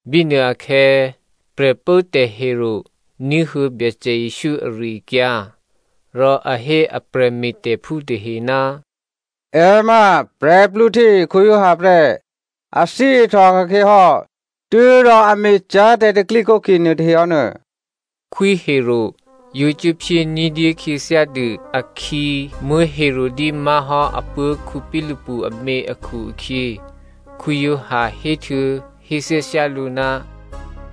Bínuôakhè̌ Prè̤pốtè̤ Herodè ní̤huô̌ Byacè Jesǔ ari-akyǎ. Rò a hé a prè̤me̤tè̤phú tahe, “È ma Giovanni Baptista prè́, a thyěihtòka̤khyě hò́, tû́rò a me̤cyá̤ tè̤pro̤tè̤prya̤ nuôtahe hò́nuô.” Khwí Herodè yǒ cuốphyé ní̤dyé khyěthyádû akhǐ Herodia má̤hò́ apuố̤ Philipu amě akhu-akhyě, Giovanni héhtuô̌héthyáthyá lǔ,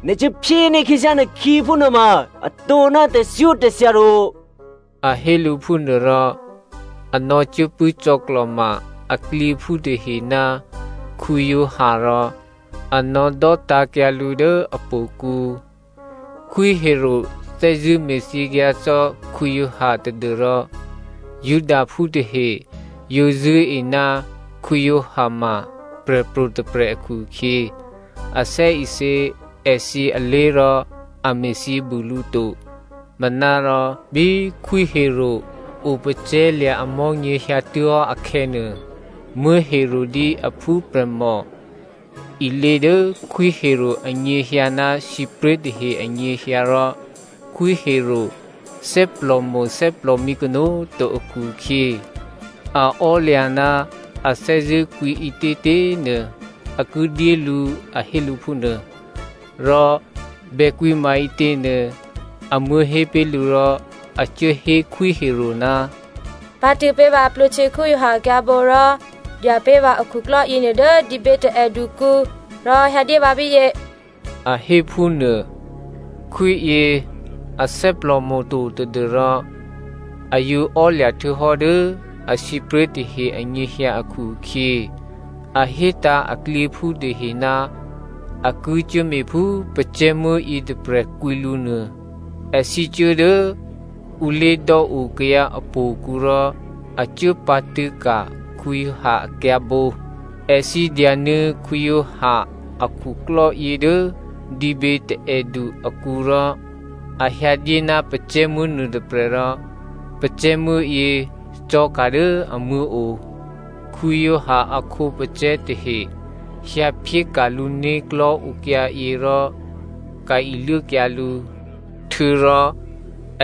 “Nè̤ cuốphyéní̤ khyěthyá nè̤khǐ phúnuô ma atǒ ná tè̤thyótè̤thya to.” A hé lǔ phúnuôrò a nò̌cuốpṳ̂́ cò̌klò̤ma aklyěphú tahe ná Giovanni rò a nò̌dò́tǎ̤kyǎ lǔ dố htò̌kǔ. Khwí Herodè thè́zṳ̂́ me̤thyěkyǎ cò́ Giovanni tadû́rò Judaphú tahe yǒ zṳ̂́e ná Giovanni ma prè̤pro̤ tôprè̤ akhu-akhyě, a thè́isě èthǐ alé̤ rò a me̤thyě bû lǔ to. Manárò bí Khwí Herodè o pacè̤̌lya̤ amò̤́nyě hyǎtuố̤hò́ akhè̌nuô, Herodia aphúprè̤mò ilě dố Khwí Herodè anyěhyǎ ná sǐpré̤ tahe anyěhyǎ rò Khwí Herodè thè́plòmo̤ thè́plòmǐ kanó̤꤮ to akhu-akhyě, a ò́lya̤ ná a thè́zṳ̂́ kwǐ ǐtětě꤮ nuô, a ki dyé lǔ a hé lǔ phúnuô. Rò bèkwǐ maǐtěnuô amuố̤ hé pé̤ lǔ rò a cuố hé Khwí Herodè, “Pǎ̤tṳ̂̌ pé̤ vǎ Giovanni Baptista akyǎ̤bǒ rò dya pé̤ vǎ akhuklò́ yěnuô dố dǐbě taè̌dukǔ rò hyǎdyé vǎ bíyě,” a hé phúnuô. Khwíyě a thè́plòmo̤ to tadû́rò a yǒ ò́lya̤ htuô̌hò́ dố asǐpré̤ tahe anyěhyǎ akhu-akhyě a hétǎ̤ aklyěphú tahe ná a ki cuốme̤phú pacè̤̌muố̤ yětôprè̤ kwǐ lǔ nuô. Èthǐ cuố dố ǔ lé̤dò́o kayǎ htò̌kǔ rò a cuốpǎ̤tṳ̂̌ ka̤ Giovanni akyǎ̤bǒ. Èthǐ dyanuô̌ Giovanni a khuklò́yě dố dǐbětaè̌du akǔ rò a hyǎdyé ná pacè̤̌muố̤ nuôtôprè̤ rò pacè̤̌muố̤yě cò̤̌ka̤ dố amuố̤ o. Giovanni a khǒpacè̤̌ tahe hyǎphyéka̤ lǔ né̤klò̤́ okyǎyě rò ka̤ iluốkyǎ lǔ. Htuô̌rò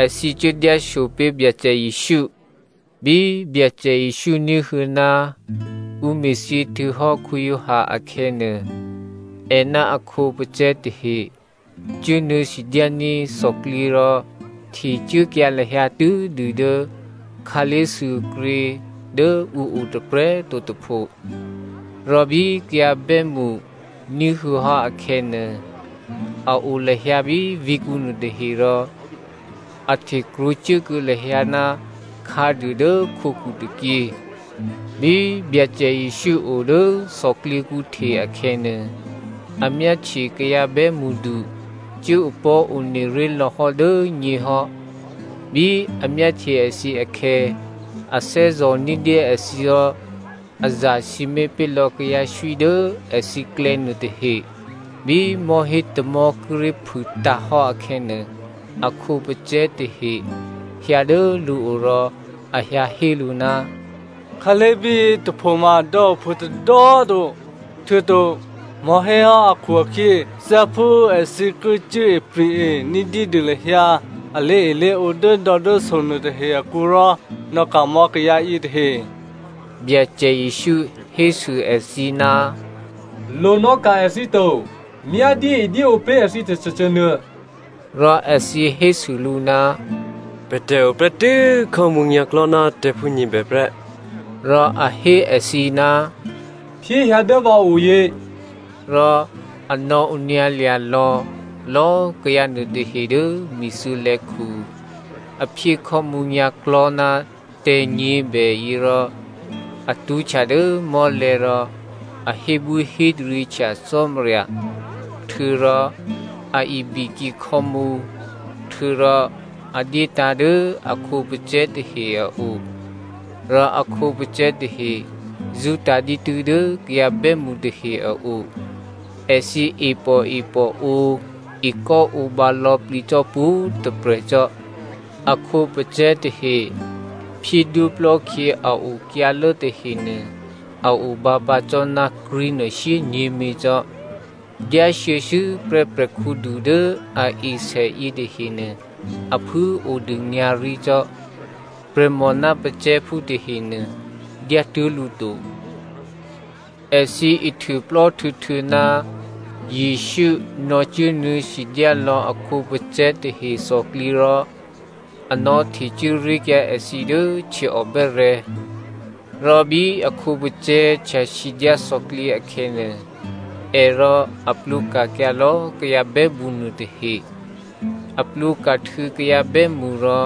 èthǐ cuố dyásopé̤ Byacè Jesǔ. Bí Byacè Jesǔ ní̤huô̌ ná ǔ me̤thyě htuô̌hò́ Giovanni akhè̌nuô, è ná a khǒpacè̤̌ tahe cuốnuô̌ sidyání̤ thòklyě rò htecuốkyǎ lahyǎ tû́dû dố khǎlé̤thuôkrě dố ǔ o tôprè̤꤮ to tôpho. Rò bí kayǎ bè́mṳ ní̤huô̌hò́ akhè̌nuô, a o lahyǎ bí vǐ̤kǔ nuôtahe rò a htekrwǒ cuốkuô̌ lahyǎ ná khǎduô dố khǒkhu tôkyě. Bí Byacè Jesǔ o dố thòklyěkǔ hte akhè̌nuô, a myáhtye kayǎ bè́mṳdu cuố opò̤́ one ré̤ lò̌hò́ dố nyěhò́. Bí a myáhtye èthǐ akhè̌ a thè́zò̤ ní̤dyé èthǐ rò a zasǐmé̤ pé̤lò̌ kayǎswí dố èthǐklè̌ nuôtahe. Bí mò̤́hé tamò̤́ kíré̤ phûtǎ̤hò́ akhè̌nuô, a khǒpacè̤̌ tahe hyǎ dố lǔo rò a hyǎhé lǔ, “Khǎlé̤ bíyětôphoma dò̌ ophû tôdò̌꤮ to, htuô̌to mò̤́hé hò́ akhu-akhyě thyáphú èthǐ ki cuốipri̤-e ní̤dyédû lahyǎ a lé̤elé̤ǒ dốdò̌dốso nuôtahe akǔ rò nò̌ka̤mò̌ kayǎ yětahe.” Byacè Jesǔ hésû èthǐ, “Lonò̌ka̤ èthǐ to. Myá dyéedyéǒ pé̤ èthǐ tôcôcô nuô.” Rò èthǐ hésû lǔ, “Pè̤tè̤ o prè́tû́ khò́mǔ nyǎ̤klò̤́ ná tè̤̌phú nyě̤bè prè́.” Rò a hé èthǐ, “Phyéhyǎ dố vǎ o yě.” Rò a nò̌onyǎlya̤lò̌ lò̌꤮ kayǎ nuôtahe dố mi̤thuô̌lè̌khu. A phyé khò́mǔ nyǎ̤klò̤́ ná tè̤̌ nyě̤bèyě rò a tṳ́htya dố mò́lè̤̌ rò a hébwíhétaryěhtya Cò́marya htuô̌rò a ibikyě khò́mǔ. Htuô̌rò a dyétǎ̤ dố a khǒpacè̤̌ tahe a o. Rò a khǒpacè̤̌ tahe zṳ́tǎ̤ dǐtû́ dố kayǎ bè́mṳ tahe a o. Èthǐ e pòepòǒ ekò́ǒbǎ lò̌plǐ cò́ pwǒ̤꤮ tôprè̤ cò́. A khǒpacè̤̌ tahe phyédwóplò́ khyě a okyǎlố tahenuô a obǎ pǎ cò́ ná krí̤nuô shyényě̤mě cò́. Dyáshuô̌shuô̌prè́ prè̤khǔdu dố a e sè yětahenuô a phû꤮ odû nyǎ̤rí cò́. Prè̤mò ná pacè̤̌phú tahenuô dyátuố̤ lǔ to. Èthǐ ihtuôplò́ htuô̌htuô̌ ná Jesǔ nò̌cuốnuô̌ sidyá lò̌ a khǒpacè̤̌ tahe thòklyě rò a nò̌htecuố ré̤kyǎ èthǐ dố htyěò bè́rè̤̌. Rò bí a khǒpacè̤̌ htyasidyá thòklyě akhè̌nuô, è rò a plwǒka̤kyǎ lò̌ kayǎ bè́mṳ nuôtahe. A plwǒka̤htuô̌ kayǎ bè́mṳ rò,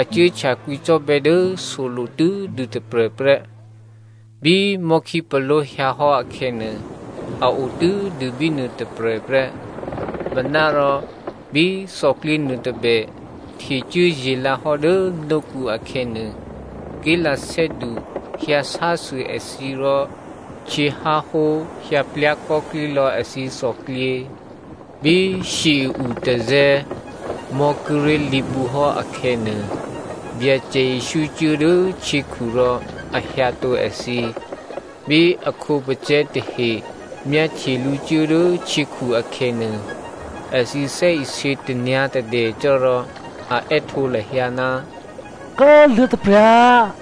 a cuốhtya kwǐcò́bè̌ dố solo̤ tû́dû tôprè̤ prè́. Bí mò̤́khípaló̤ hyǎ hò́ akhè̌nuô, a o tû́dû bínuô tôprè̤ prè́. Manárò bí thòklyě nuôtôbè htecuố ye̤lǎhò́ dố nókǔ akhè̌nuô, ké̤lathè́du hyǎsásû èthǐ rò htyěháhó hyǎplyá̤ kò́klí lò̌ èthǐ thòklyě. Bí shyě i-utazè̤̌ mò̤́ kíré̤ lǐbǔhò́ akhè̌nuô, Byacè Jesǔ cuố dố htyěkhu rò a hyǎtǒ èthǐ. Bí a khǒpacè̤̌ tahe myáhtye lǔ cuố dố htyěkhu akhè̌nuô, èthǐ thè́isě tanyǎ̤tadè cò́ rò a è́htǒ lahyǎ, “Kố꤮ luô̤̌taprya̤.”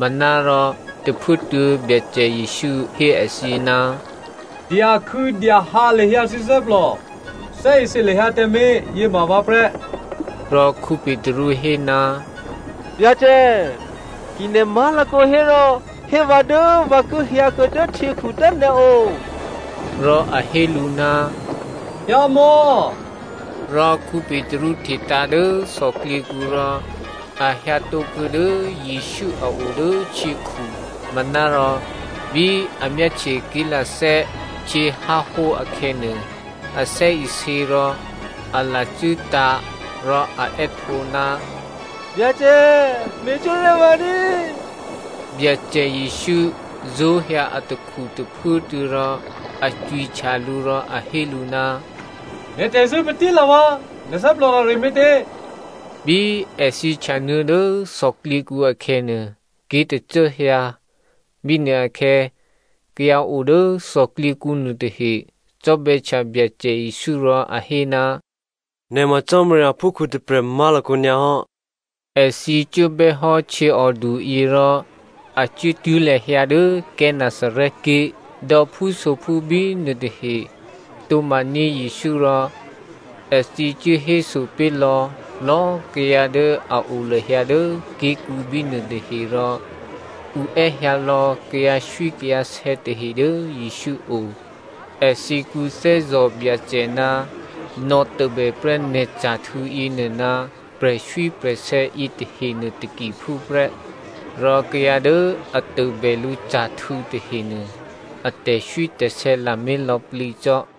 Manárò tôphuốtuô̌, Byacè Jesǔ hé èthǐ, “Dyakhû̌dyahǎ lahyǎ thǐ thè́plò. Thè́isě lahyǎ tǎmé̤, yěma vǎ prè́.” Rò Petru hé, “Byacè, ki nè̤ má̤lakǒ hérò hé vǎ dố vǎ ki hyǎkuô̌ dố htyěkhu dố nè̤ o.” Rò a hé lǔ, “hyǎmò̌.” Rò Petru tǎ̤hte dố thòklyěkǔ rò a hyǎtǒkuô̌ dố Jesǔ a o dố htyěkhu. Manárò bí a myáhtye ké̤lathè́ htyěháhó akhè̌nuô, a thè́isě rò a lacû́tǎ̤, rò a è́htǒ, “Byacè, me̤cwó̤ ré̤ vǎ ní꤮.” Byacè Jesǔ zó̤hyǎ atakhu tôphuốtuô̌ rò a cwihtya lǔ rò a hé lǔ, “Nè̤ tè̤zṳ̂́ patí꤮ lǎ vǎ꤮, nè̤ thè́plò rare me̤tě?” Bí èthǐ htyanuô̌ dố thòklyěkǔ akhè̌nuô, ké̤tacố hyǎ. Bínuôakhè̌ kayǎ o dố thòklyěkǔ nuôtahe cò́bè̌htya Byacè Jesǔ rò a hé, “Nè̤ ma Cò́marya aphúkhǔ tôprè̤ má̤lakǒ nyǎ hò́.” Èthǐ cuốbè́ hò́ htyěòduyě rò a cuốtuố̤ lahyǎ dố Gennesaret ké̤. Dò̌phúsophú bínuô tahe tǒ̤maní̤ Jesǔ rò èthǐ cuốhéso pé̤lò̌ lò̌꤮ kayǎ dố a o lahyǎ dố ké̤kǔ bínuô tahe rò ǔ è́hyǎ lò̌ kayǎswí kayǎsè̌ tahe dố Jesǔ o. Èthǐ kwǐthè́zò̤ Byacè ná nò̌tôbè prè́ nè̤ ca̤htû̌ yěnuô ná prè̤swí prè̤sè̌ yětahenuô takiphúprè́. Rò kayǎ dố a tôbè lǔ ca̤htû̌ tahenuô, a tè̤swítè̤sè̌ lamé̤ lò̌plǐ cò́.